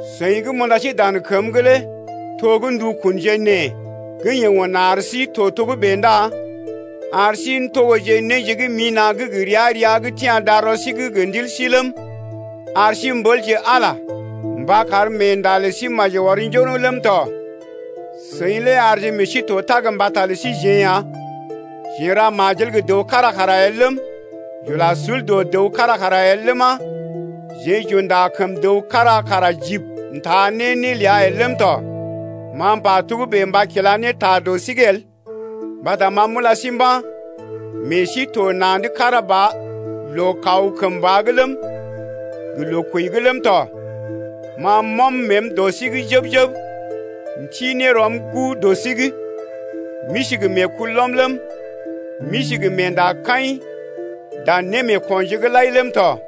Seḭ gə́ m’unda sí dan kəm’g lé to gə́ ndukunje nee gə́ yeḛ un ar sí to togə́bè ndá ar sí n’togoje néje gə́ mina̰ gə́ gə ria-ria gə́ tia̰ darɔ sí’g gə ndil sí’g ləm, ar sí m’ɓəlje Ala mba kar meenda lə sí maji ɔr njoroŋ ləm tɔ. Seḭ lé arje meḛ sí to tag mbata lə síjeḛ ya. Jeḛ j’ra majel gə dəw kára kara el ləm, j’ula sul dɔ dəw kára kara el ləma, jeḛ j’unda kəm dəw kára kara jibi n’taa ne né ləa el ləm tɔ. Ma m’pa togə́bè mba kila ne ta dɔ sí’g el, mbata ma m’ula sí mba̰, meḛ sí to na̰’d kára ba loo kaw kəmba’g ləm, gə loo kwəi’g ləm tɔ. Ma m’ɔm məəm dɔ sí’g jəb-jəb m’ti ne rɔm guu dɔ sí’g. M’isi gə meekulɔm ləm, m’isi gə meendakaḭ dan némeekonje’g lai ləm tɔ.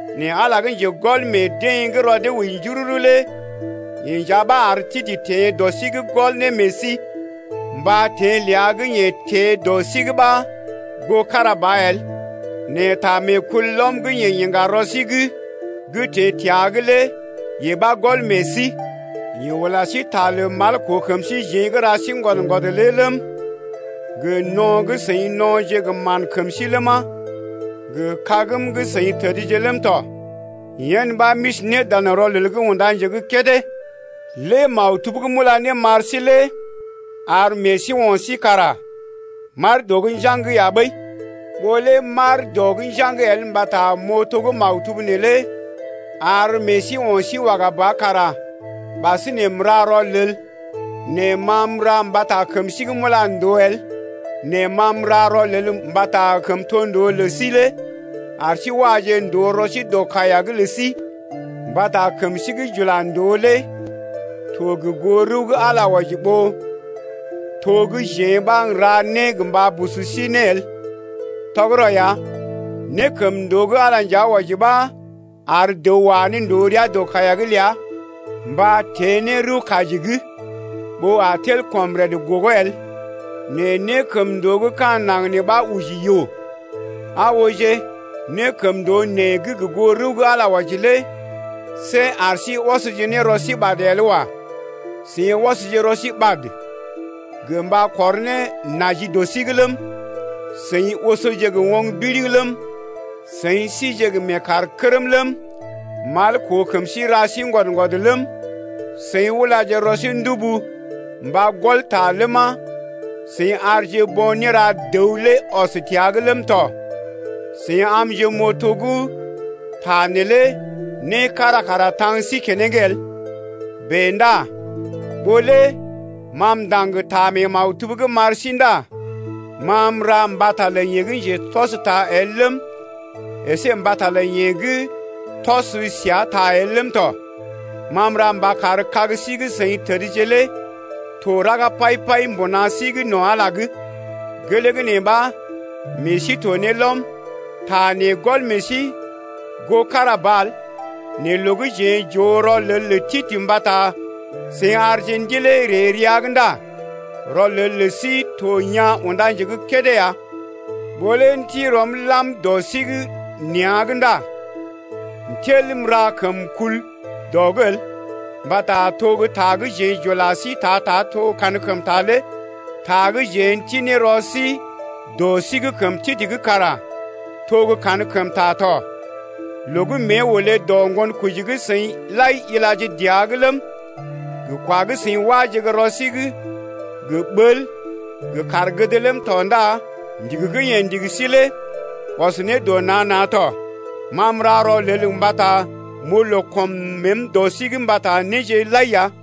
Nɛ Ala gə́ njegɔl meḛ deḛ gə́ rɔ dee wəi njururu lé yeḛ nja ɓa ar Titə teḛ dɔ sí’g gɔl ne meḛ sí, mba teḛ ləa gə́ yeḛ teḛ dɔ sí’g ɓa goo kára ba el, nɛ ta meekulɔm gə́ yeḛ iŋga rɔ sí’g gə́ teḛ təa’g lé yee ɓa gɔl meḛ sí. Yeḛ ula sí ta mal koo kəm síjeḛ gə́ ra sí ŋgwɔd-ŋgwɔd lé ləm, gə no̰ gə́ seḭ no̰je gə mán kəm sí ləma, gə kagm gə́ seḭ tədje ləm tɔ, yen ɓa, m’isi ne dan rɔlel’g unda nje gə́ kédé. Lé maktub gə́ m’ula ne m’ar sí lé ar meḛ sí o̰ sí kara m’aar dɔ’g njaŋg ya ɓəi. Ɓó lé m’aar dɔ’g njaŋg el mbata m’oo to gə́ maktub neelé ar meḛ sí o̰ sí waga ba kara ɓasinè m’ra rɔlel nɛ ma m’ra mbata kəm sí gə́ m’ula ndòo el nɛ ma m’ra rɔlel mbata kəmtondoo lə sí lé ar sí waje ndòo rɔ sí dɔ kaiya’g lə sí. Mbata kəm sí gə́ j’ula ndòo lé to gə goo rəw gə́ Ala wɔji ya ɓó to gə́ jeḛ ɓa n’ra né gə mba busu sí ne el. Tɔgərɔ ya, nékəmndoo gə́ Ala nja wɔji ɓa ar dəw wa ne ndòo rəa dɔ kaiya’g ləa mba teḛ ne rəw-kaji’g, ɓó a tel kɔm rəd gogo el. Nɛ nékəmndoo gə́ ka̰ naŋg nee ɓa oji yoo. Aa ooje, nékəmndoo nee gə́ gə goo rəw gə́ Ala wɔji lé see ar sí ɔsje ne rɔ sí ɓad el wa. Seḭ ɔsje rɔ sí ɓad gə mba kɔr ne naji dɔ sí’g ləm, seḭ osoje gə oŋg biriŋ ləm, seḭ síje gə meekaarkərm ləm, mal koo kəm ra sí ŋgwɔd-ŋgwɔd ləm, seḭ ula rɔ sí ndubu mba gɔl ta ləma, seḭ arje bo̰ néra dəw lé ɔs təa’g ləm tɔ. Seḭ amje m’oo to gə́ ta neelé né kára kara taŋ sí keneŋ el. Bèe ndá ɓó lé ma m’ndaŋg ta mee maktub’g m’ar sí ndá ma m’ra mbata lə yeḛ gə́ njetɔsta el ləm, əsé mbata lə yeḛ gə́ yeḛ tɔs səa ta el ləm tɔ. Ma m’ra mba kar kag sí gə́ seḭ tədje lé to raga pai-pai mbuna sí’g no̰ Ala’g ya. Gelee gə́ nee ɓa meḛ sí to ne lɔm. Ta nee gɔl meḛ sí goo kára ba el nɛ loo gə́ jeḛ j’oo rɔlel lə Titə mbata seḭ arje ndilee ree rəa’g ndá rɔlel lə sí to yaa̰ unda nje gə́ kédé ya. Ɓó lé m’ti rɔm lam dɔ sí’g nea̰’g ndá m’tel m’ra kəm kul dɔ’g el, mbata to gə́ ta gə́ jeḛ j’ula sí ta-ta to kankəmta lé ta gə́ jeḛ n’ti ne rɔ sí dɔ sí’g kəm Titə’g kara to gə́ kankəmta tɔ. Loo gə́ mée olé dɔ ŋgonkoji gə́ seḭ lai ilaje dəa’g ləm, gə kwa gə́ seḭ wáje gə́ rɔ sí’g gə ɓəl gə kaar gəd ləm tɔ ndá ndigi gə́ yeḛ ndigi sí lé ɔs né dɔ nan-nan tɔ. Ma m’ra rɔlel mbata m’oo loo kɔm məəm dɔ sí’g mbata néje lai ya.